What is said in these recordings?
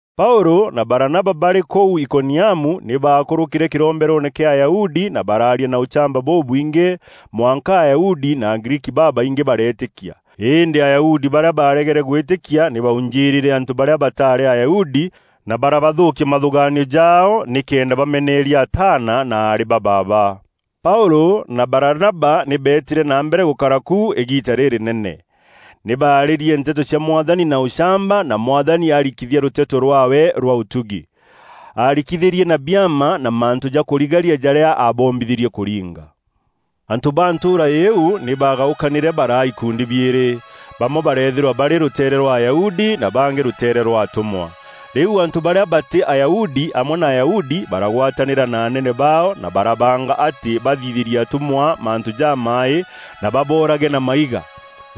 Paûlû na Baranaba barî kûu Ikoniamu nî baakûrûkîre kîromberoone kîa Ayahudi na baraaria na ûchamba bûbwingî mwanka Ayahudi na Agriiki babaingî bareetîkia. Îndî Ayahudi barîa baaregere gwîtîkia nî baaujîrîre antû barîa bataarî Ayahudi na barabathûkia mathûgaanio jaao nîkenda bameneeria ataana na aarî ba baaba. Paûlû na Baranaba nî beetîre na mbere gûkara ku îgiita rîrînene. Nî baarîrie nteto cia Mwathani na ûchamba, na Mwathani ararikithia rûteto rwaawe rwa ûtugi. Aarikithîrie na biama na mantû ja kûrigaria jarîa aabombithîrie kûringa. Antû ba ntûûra îîu nî baagaûkanîre baraa ikundi biîrî; bamwe bareethîrwa barî rûteere rwa Ayahudi, na bangî rûteere rwa atûmwa. Rîu antû barîa batî Ayahudi amwe na Ayahudi, baragwatanîra na anene baao, na barabanga atî bathithîrie atûmwa mantû jamaaî na baboorage na maiga.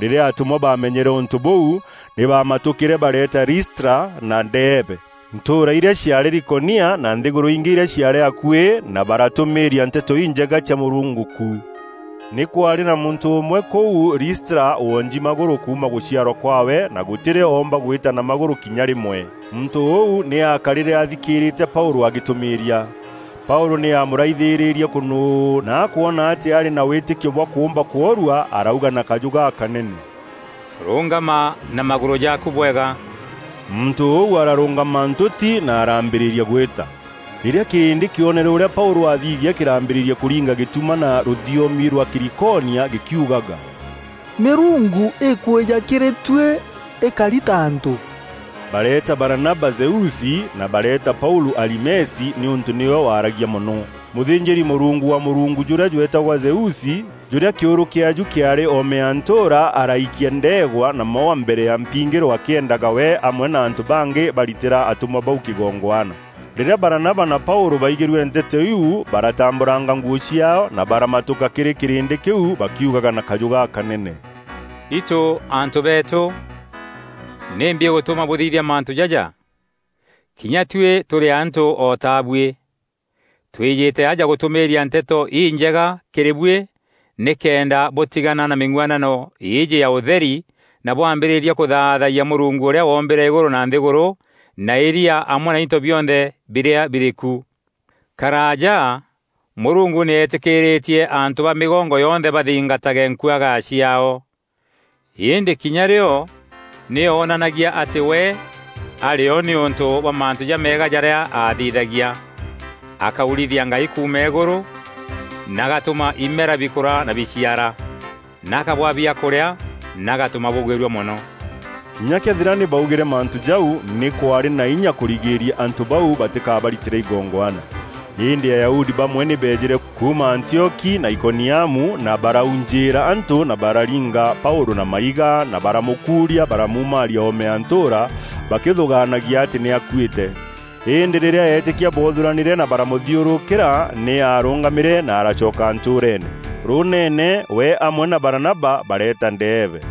Rîrîa atûmwa baamenyere ûntû bûu, nî baamatûkîre bareeta Listra na Deebe, ntûûra irîa ciaarî Likonia, na nthîgûrû ingî irîa ciaarî akuî, na baratûmîîria Nteto Injega cia Mûrungu ku. Nî kwaarî na muntû ûmwe kûu Listra wonji magûrû kuuma gûciarwa kwaawe na gûtî rîo oomba gwîta na magûrû kinya rîmwe. Muntû ûu nî aakarîre athikîîrîte Paûlû agîtûmîîria. Paûlû nî aamûraithîrîrie kûnûû na akwona atî arî na wîtîkio bwa kûûmba kworua, arauga na kajû gakanene, “Rûngama na magûrû jaaku bwega!” Muntû ûu ararûngama ntûti na araambîrîria gwîta. Rîrîa kîrîndî kîonere ûrîa Paûlû athithia kîraambîrîria kûringa gîtuma na rûthiomi rwa Kîlîkonia gîkiugaga, “Mîrungu îkwîja kîrî tuî îkari ta antû!” Bareeta Baranaba Zeusi na bareeta Paûlû Harimesi nîûntû nîwe waaragia mono. Mûthînjîri-mûrungu wa mûrungu jûrîa jweetagwa Zeusi, jûrîa kîûrû kîaaju kîaarî oome ya ntûûra, araikia ndeegwa na maûa mbere ya mpingîro akîendaga we amwe na antû bangî baritîra atûmwa bau kîgongwana. Rîrîa Baranaba na Paûlû baigîrue nteto iu baratambûranga nguû ciaao na baramatûka kîrî kîrîndî kîu bakiugaga na kajû gakanene: “Itû antû beetû, nîmbi îgûtûma bûthithia mantû jaja? Kinya tuî tûrî antû o ta buî. Twîjîte aja gûtûmîîria Nteto Injega kîrî buî, nîkenda bûtîgana na mîng'uanano îîjî ya ûtheri, na bwambîrîria kûthaathayia Mûrungu ûrîa woombîre Îgûrû na nthîgûrû na îria amwe na into bionthe birîa birî ku. Karaaja Mûrungu nî eetîkîîrîtie antû ba mîgongo yonthe bathingatage nkuagaya ciaao. Îndî kinya rîo nî oonanagia atî we arî o nîûntû bwa mantû jameega jarîa aathithagia: akaurithia ngai kuuma îgûrû, na agatûma imera bikûra na biciara, na akabwaa biakûrîa na agatûma bûgwîrua mono.” Kinya këethîra nî baugîre mantû jau, nî kwaarî na inya kûrigîria antû bau batîkabaritîre igongwana. Îndî Ayahudi bamwe nî beejîre kuuma Antioki na Ikoniamu na baraujîîra antû na bararinga Paûlû na maiga, na baramûkuuria baramuumaria oome ya ntûûra bakîthûgaanagia atî nî aakuîte. Îndî rîrîa eetîkia boothûranîre na baramûthiûrûkîra, nî aarûngamîre na aracoka ntûûreene. Rûûneene we amwe na Baranaba bareeta Deebe.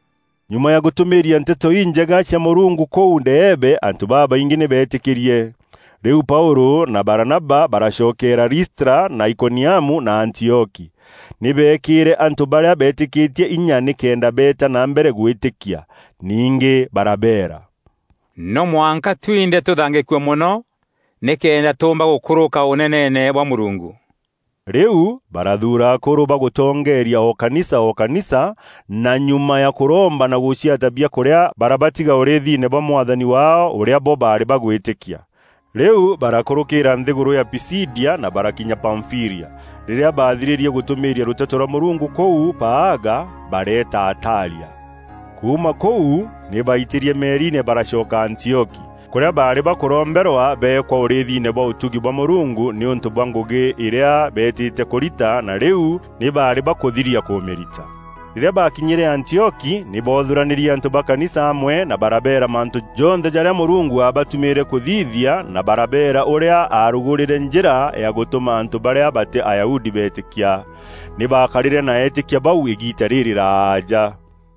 Nyuma ya gûtûmîîria Nteto Injega cia Mûrungu kûu Deebe antû babaingî nî beetîkîrie. Rîu Paûlû na Baranaba baracokeera Listra na Ikoniamu na Antioki. Nî beekîre antû barîa beetîkîtie inya nîkenda beeta na mbere gwîtîkia. Ningî barabeera, “No mwanka twinthe tûthangîkue mono nîkenda tûûmba gûkûrûka Ûneneene bwa Mûrungu.” Rîu barathuura akûrû ba gûtongeeria o kanisa o kanisa, na nyuma ya kûromba na gûciata biakûrîa barabatiga ûrîîthine bwa Mwathani waao, ûrîa bo baarî bagwîtîkia. Rîu barakûrûkîîra nthîgûrû ya Pisidia na barakinya Pamfîlia. Rîrîa baathirîrie gûtûmîîria rûteto rwa Mûrungu kûu Paaga, bareeta Atalia. Kuuma kûu nî baitîrie meriine baraacoka Antioki, kûrîa baarî bakûromberwa beekwa ûrîîthine bwa ûtugi bwa Mûrungu nîûntû bwa ngûgî îrîa beetîte kûrita na rîu nî baarî bakûthiria kûmîrita. Rîrîa baakinyîre Antioki nî boothûranîrie antû ba kanisa amwe na barabeera mantû jonthe jarîa Mûrungu aabatumîîre kûthithia na barabeera ûrîa aarugûrîre njîra ya gûtûma antû barîa batî Ayahudi beetîkia. Nî baakarîre na eetîkia bau îgiita rîrîraaja.